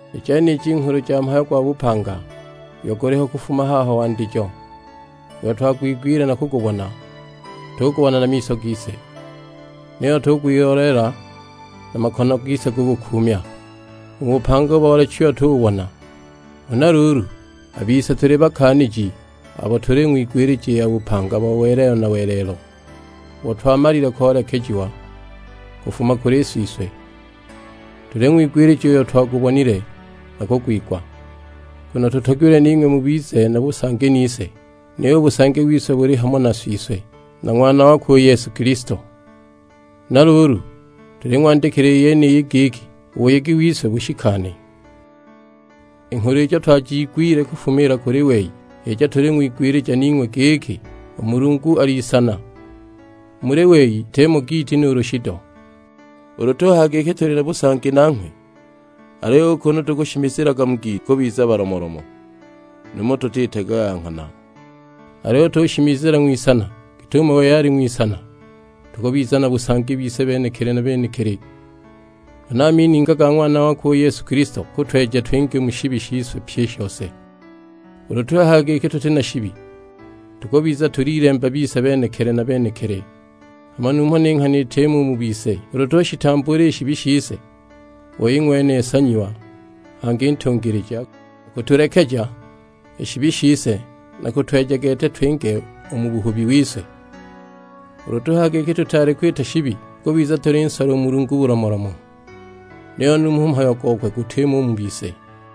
I jeniji nghulu ja Mhayo gwa bupanga, uyo guliho kufuma haho wandijo, uyo twagwigwile nu kugubona tugubona na miso gise, niyo tugwiloleela; na a makono gise gugukuumya. U bupanga boolechiwe tububona. Huna luulu, a bise tuli bakaaniji abo tuling'wigwilija i ya bupanga bo welelo na welelo, ubo twamalile koolekejiwa kufuma kuli Siswe. Tuling'wigwilija uyo twagubonile na kugwigwa, nguno tutogilwe ning'we mubize na busangi nise; niyo u busangi wise buli hamo na Siswe, nu Ng'wana wakwe u Yesu Kilisto. Huna luulu tuling'wandikila i yeniyi giki u buyegi wise bushikane. I nghulu ijo twajiigwile kufumiila kuli wei h'ijo tuling'wigwilija ning'we; giki, u Mulungu ali Isana, u muli we shitimo giiti nuulu shido. Ulu tuhaya giki tuli na busangi nanghwe, aliyo u kunu tukushimizilaga mu giiti, tukubiza balomolomo, numho tutitaga ya nghana. Aliyo ulu tushimizila ng'wisana git'umo wei ali ng'wisana, tukubiza na busangi bise benekili na benekili, huna a mininga ga Ng'wana wakwe u Yesu Kilisto gakutweja twinge u mu shibi shise pyi i shose. Ulu tuhaya giki tuti na shibi, tukubiza tulilemba bise benekili na benekili, hama numho ni nghana itimo u mu bise! Ulu tushitambuula i shibi shise, u wei ng'wene nsanyiwa, hangi ntungilija, akutulekeja i shibi shise na kutweja gete twinge u mu buhubi wise. Ulu tuhaya giki tutaali kwita shibi, tukubiza tulinsola u Mulungu bulomolomo; niyo numho u mhayo gokwe gutimo u mu bise.